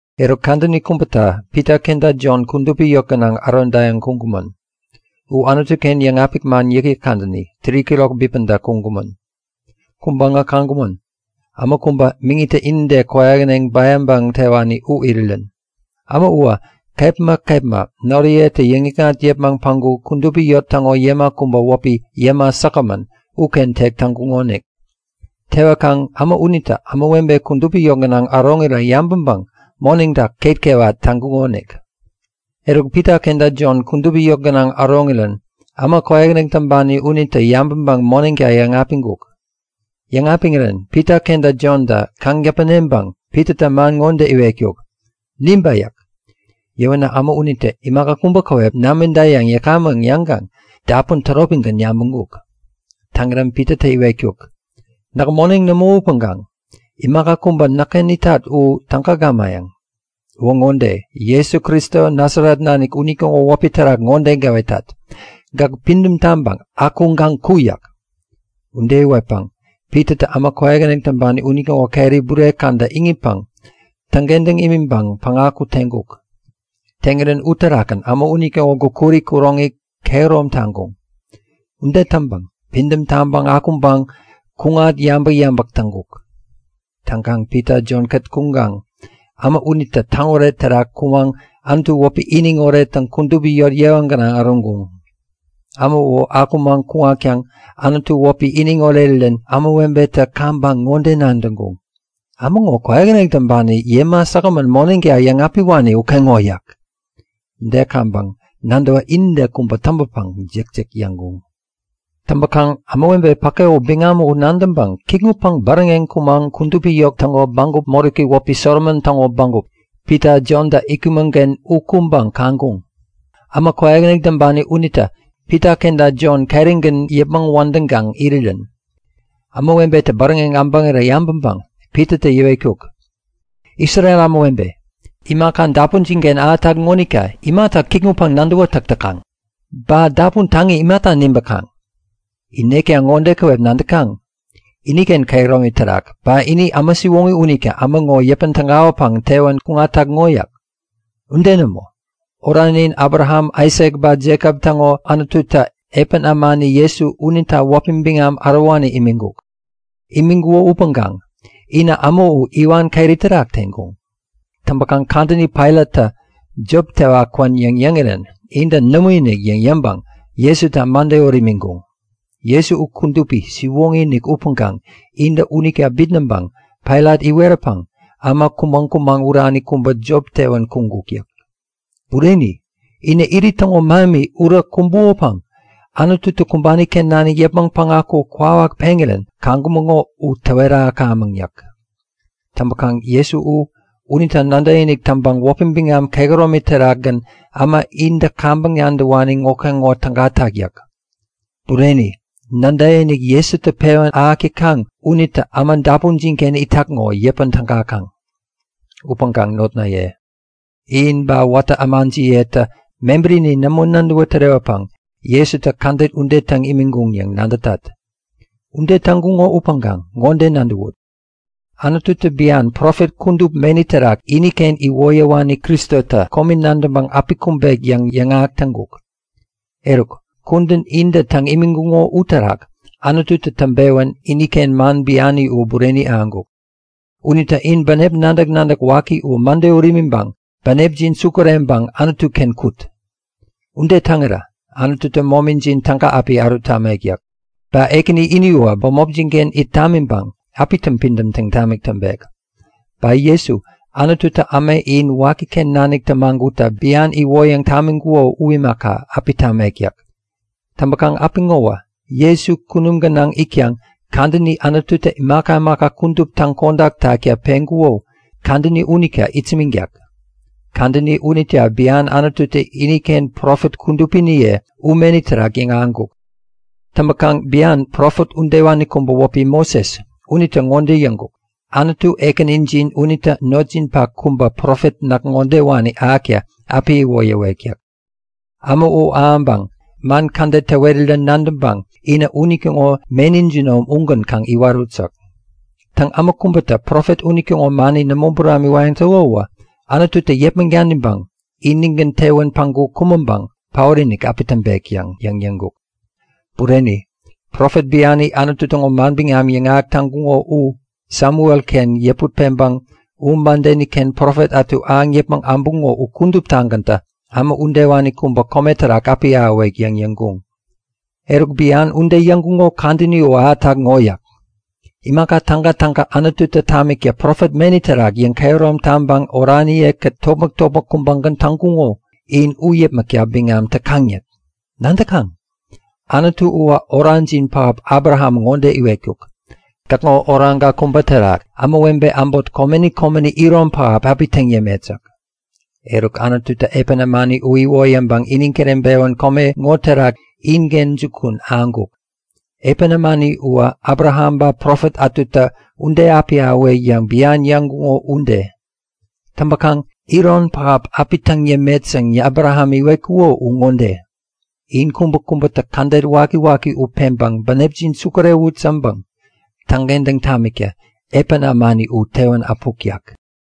Eruk kadäni kubäta Pita kenta Jon kudupi yot gänaŋ ärodayäŋ kuŋkumän. U Anutu-ken yäŋapik man yäkyäk kadäni, 3'kirok bipäda kuŋkumän. Kuŋpäŋä kaŋkumän; Äma kubä, miŋitä inide kwäyähäneŋ bäyaŋpäŋ tewani u irirän. Äma uwä kepma kepma noriyetä yäŋikŋat yäpmäŋ päŋku kudupi yot täŋo yäma kubä, wäpi Yäma Säkgämän uken tek täŋkuŋonik. Tewäkaŋ äma unitä ämawebe kudupi yot gänaŋ äroŋirä yabäŋpäŋ moneŋta ketkewat täŋkukonik. Eruk Pita kenta Jon kudupi yot gänaŋ äroŋirän äma kwäyähäneŋ täŋpani unitä yabäŋpäŋ moneŋta yäŋapiŋkuk. Yäŋapiŋirän Pita kenta Jontä kaŋ täpäneŋpäŋ Pitatä man ŋode iwetkuk; Nibä! yäk. Yäwänä äma unitä imaka kubä käwep namida yäŋ yäkamän yäŋkaŋ dapun täropigän yabäŋkuk. Täŋirän Pitatä iwetkuk; Näk moneŋ nämo upäŋkaŋ imaka kubä näkken itak u täga gamayäŋ. Uwä ŋode; Jesu Kristo Nasaret nanik unitäŋo wäpi terak ŋode gäwetat; Gäk pidäm taŋpäŋ akuŋkaŋ ku! yäk. Ude iwetpäŋ Pitatä äma kwäyähäneŋ täŋpani unitäŋo keri bure käda iŋitpäŋ täŋkentäŋ imiŋpäŋ päŋaku teŋkuk. Teŋirän uterakgän äma unitäŋo gukuri kuroŋi kehärom taŋkuŋ. Ude täŋpäŋ pidäm taŋpäŋ akuŋpäŋ kuŋat yabäk-yabäk täŋkuk. Täŋkaŋ Pita Jon-kät kuŋkaŋ äma unitä täŋoret terak kumaŋ Anutu wäpi iniŋ orettäŋ kudupi yot yewa gänaŋ äroŋkuŋ. Äma u akumaŋ kuŋatkaŋ Anutu wäpi iniŋ orerirän ämawebetä kaŋpäŋ ŋode nadäŋkuŋ; Äma ŋo kwäyähäneŋ täŋpani Yäma Säkgämän-ken moneŋta yäŋapiwani ukeŋo! yäk. Ude kaŋpäŋ nadäwä inide kubä täŋpäpäŋ jäkjäk yäŋkuŋ. Täŋpäkaŋ ämawebe päke u biŋam u nadäŋkaŋ kikŋutpäŋ bäräŋeŋ kumaŋ kudupi yot täŋo bägup moräki wäpi Solomon täŋo bägup, Pita Jontä itkumän-ken u kuŋpäŋ kaŋkuŋ; Äma kwäyähäneŋ täŋpani unitä Pita kenta Jon kerigän yäpmäŋ wädäŋkaŋ irirän. Ämawebetä bäräŋeŋ äbäŋirä yabäŋpäŋ Pitatä yäwetkuk; Isrel ämawebe, imaka dapunjin-ken ahätak ŋonita imata kikŋutpäŋ-nadäwätäk täkaŋ? Ba dapun taŋi imata nibäkaŋ? In nekta ŋode käwep nadäkaŋ; Iniken kehäromi terak, ba ini äma siwoŋi unita äma ŋo yäpän tägawäpäŋ tewän kuŋatak ŋo. Ude nämo! Oranin Abraham, Aisak ba Jekop täŋo Anututä epän ämani Jesu unita wäpi biŋam ärowani imiŋkuk. Imiŋkuko upäŋkaŋ inä äma u iwan keri terak teŋkuŋ. Täŋpäkaŋ kadäni Pailattä jop tewa kwän yäŋ yäŋirän intä nämoinik yäŋ yäŋpäŋ Jesuta mäde ut imiŋkuŋ. Jesu u kudupi, siwoŋi-inik upäŋkaŋ intä unita bitnäŋpäŋ Pailat iweräpäŋ äma kumäŋ-kumäŋ urani kubä jop tewän kuŋkuk yäk. Bureni! Inä irit täŋo mähemi urä kumbukopäŋ Anututä kumbani-ken nanik yäpmäŋ päŋaku kwawak peŋirän kaŋkumäŋo u täwet ahäkamäk yäk. Täŋpäkaŋ Jesu u, unita nadäkinik täŋpäŋ wäpi biŋam kehäromi terakgän äma intä kaŋpäŋ nadäwani ŋokeŋo tägatak yäk. Bureni, nadäkinik Jesutä pewän ahäk täkaŋ unitä äma dapunjin-ken itak ŋo yäpän tägakaŋ. Upäŋkaŋ notnaye, in ba watä ämajiyetä mebärini nämo nadäwä tärewäpäŋ Jesuta kädet ude täŋ imiŋkuŋ yäŋ nadätat. Ude täŋkuŋo upäŋkaŋ ŋode nadäwut; Anututä bian profet kudup meni terak iniken iwoyäwani Kristotä komi nadäŋpäŋ api kumbek yäŋ yäŋahäk täŋkuk. Eruk, kudän intä täŋ imiŋkuŋo uterak Anututä täŋpewän iniken man biani u bureni ahäŋkuk. Unita in bänep nadäk-nadäk waki u mäde ut imiŋpäŋ bänepjin sukureŋpäŋ Anutu-ken kut! Ude täŋirä Anututä momijin täga api ärut tamek yäk. Ba Ekäni ini uwä bämopjin-ken it tamiŋpäŋ api täŋpidäm taŋ tamik täŋpek. Ba Jesu, Anututä äma in wakiken nanik tämagutta bian iwoyäŋ tamiŋkuko u imaka, api tamek yäk. Täŋpäkaŋ apiŋowä Jesu kunum gänaŋ itkaŋ kadäni Anututä imaka imaka kudup täŋkodak takta peŋkuko, kadäni unita itsämäŋtak. Kadäni unita bian Anututä iniken profet kudupiniye u meni terak yäŋahäŋkuk. Täŋpäkaŋ bian profet udewani kubä wäpi Moses unitä ŋode yäŋkuk; Anutu Ekänijin unitä notjinpak kubä profet näk ŋodewani ahäkta api iwoyäwek yäk. Äma u ahäŋpäŋ man kädet täwerirän nadäŋpäŋ inä unitäŋo meni jinom ugän kaŋ iwarut yäk. Täŋ, äma kubätä profet unitäŋo mani nämo buramiwayäŋ täko uwä Anututä yäpmäŋ daniŋpäŋ inigän tewän päŋku kumäŋpäŋ paotinik api täŋpek yäŋ yäŋkuk. Bureni, profet biani Anutu täŋo manbiŋam yäŋahäk täŋkuŋo u, Samuel-ken yäput peŋkaŋ u mädeni-ken profet ätu ahäŋ yäpmäŋ äbuŋo u kuduptagäntä äma udewani kubä kome terak api ahäwek yäŋ yäŋkuŋ. Eruk bian ude yäŋkuŋo kadäni u ahätak ŋo yäk. Imaka tägatäga Anututä tamikta profet meni terak yäŋkehärom taŋpäŋ oraniye-kät topmäk-topmäk kubägän täŋkuko, in u yäpmäkta biŋam täkaŋ yäk. Nadäkaŋ? Anutu uwä orajin pähap Abraham ŋode iwetkuk; Gäkŋo oraŋka kubä terak ämawebe äbot komeni komenita iron pähap api täŋ yämet yäk. Eruk, Anututä epän ämani u iwoyäŋpäŋ iniŋ kireŋpewän kome ŋo terak inken jukun ahäŋkuk. Epän ämani uwä Abraham ba profet ätutä ude api ahäwek yäŋ bian yäŋkuŋo ude. Täŋpäkaŋ iron pähap api täŋ yämet yäŋ Abraham iwetkuko u ŋode; In kubäkubätä kädet wakiwaki u peŋpäŋ bänepjin sukurewut yäŋpäŋ täŋkentäŋ tamikta epän ämani u tewän äpuk yäk.